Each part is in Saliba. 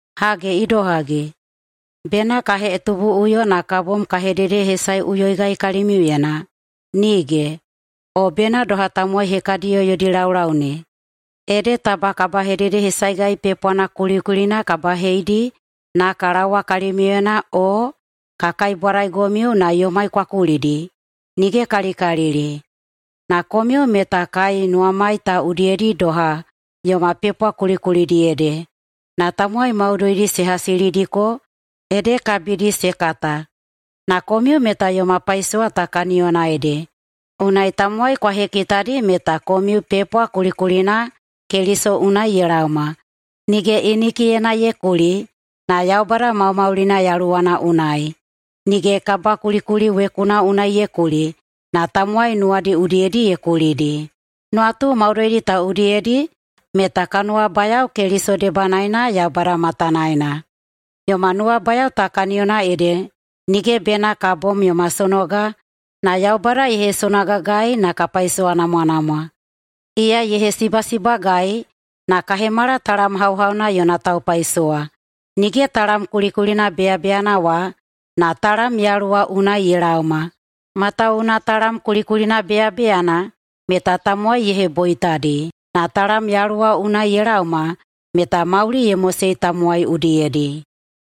Hage idohagi, bena ka hetubuꞌuyo na ka bom ka hededehesaeꞌuyoigai kalimiuyena? Nige! O bena doha tamowai hekadiyao yodi laulau ne, ede taba kabahededehesaegai pepwana kulikulina ka baheidi na ka laowa kalimiuyena o ka kaibwadaigomiu na yomai kwa kulidi? Nigekalikalili! Na komiu meta kai nuwamai ta udiyedi doha yoma pepwa kulikulidi ede, na tamowai maudoidi se hasilidiko ede kabidi se kata. Na komiu meta yoma paisowa ta kaniyona ede, unai tamowai kwa hekitadi meta komiu pepwa kulikulina Keliso unai ye laoma, nige inikiyena ye kuli, na Yaubada maumaulina Yaluwana unai, nige kabakulikuli wekuna unai ye kuli na tamowai nuwadi udiyedi ye kulidi. Nuwatu maudoidi ta udiyedi meta ka nuwabayao Keliso debanaena Yaubada matanaena. Yoma nuwabayao ta kaniyona ede nige bena ka bom yoma sonoga, na Yaubada ye hesonogagai na ka paisowanamwanamwa. Iya ye hesibasibagai na ka hemala talam hauhauna yona taupaisowa. Nige talam kulikulina beyabeyana wa, na talam Yaluwa unai ye laoma, matawuwuna talam kulikulina beyabeyana meta tamowai ye heboitadi, na talam Yaluwa unai ye laoma meta mauli ye mosei tamowai udiyedi.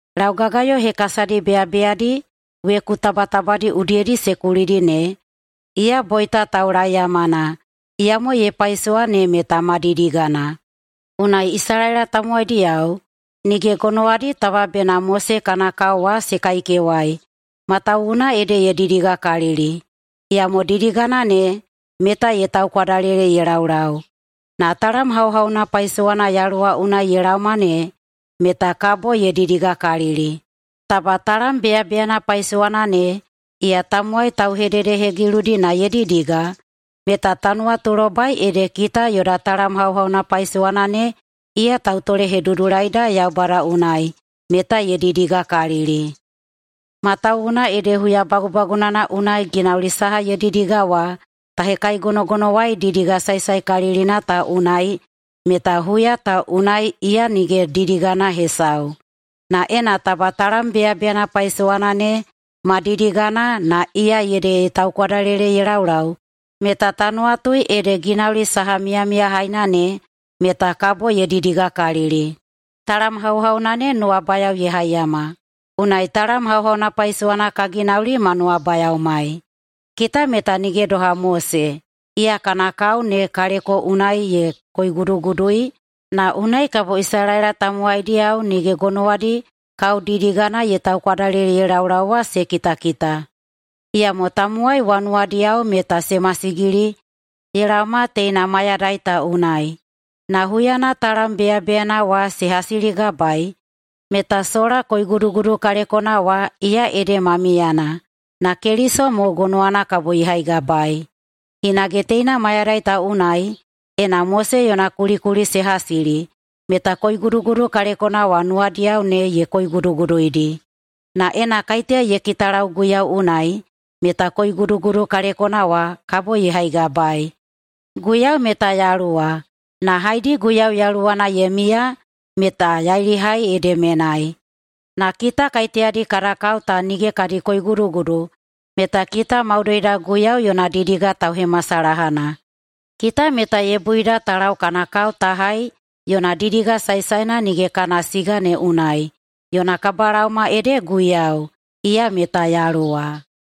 Laugagayo hekasadi beyabeyadi weku tabatabadi udiyedi se kulidi ne, iya boita taulaeyamana, iyamo ye paisowa ne meta ma didigana. Unai Isalaela tamowaidiyao nige gonowadi taba bena Mose kana kao wa se kaikewai, matawuwuna ede ye didigakalili, iyamo didigana ne meta ye taukwadalele ye laulau. Na talam hauhauna paisowana Yaluwa unai ye laoma ne meta kabo ye didigakalili. Taba talam beyabeyana paisowana ne iya tamowai tauhededehegiludi na ye didiga, meta ta nuwatulobai ede kita yoda talam hauhauna paisowana ne iya tautolehedudulaida Yaubada unai, meta ye didigakalili. Matawuwuna ede huya bagubagunana unai ginauli saha ye didiga wa ta hekaigonogonowai didiga saesaekalilina ta unai meta huya ta unai iya nige didigana hesau. Na ena taba talam beyabeyana paisowana ne ma didigana na iya ede ye taukwadalele ye laulau meta ta nuwatui ede ginauli saha miyamiyahaina ne meta kabo ye didigakalili. Talam hauhauna ne nuwabayao ye haiyama, unai talam hauhauna paisowana ka ginauli ma nuwabayaomai. Kita meta nige doha Mose iya kana kao ne kaleko unai ye koigudugudui na unai kabo Isalaela tamowaidiyao nige gonowadi kaodidigana ye taukwadalele ye laulau wa se kitakita. Iyamo tamowai wa nuwadiyao meta se masigili ye laoma teina mayadai ta unai. Na huyana talam beyabeyana wa se hasiligabaei meta sola koigudugudu kalekona wa iya ede ma miyana, na Keliso mo gonowana kabo ye haigabaei. Hinage teina mayadai ta unai, ena Mose yona kulikuli se hasili, meta koigudugudu kalekona wa nuwadiyao ne ye koiguduguduidi. Na ena kaiteya ye kitalau Guiyau unai, meta koigudugudu kalekona wa kabo ye haigabaei. Guiyau meta Yaluwa. Na haedi Guiyau Yaluwana ye miya meta yailihai ede menai. Na kita kaiteyadi kada kao ta nige kadi koigudugudu meta kita maudoida Guiyau yona didiga tauhemasalahana. Kita meta ye buida ta lau kana kao ta hai yona didiga saesaena nige kana siga ne unai, yona kabalaoma ede Guiyau, iya meta Yaluwa.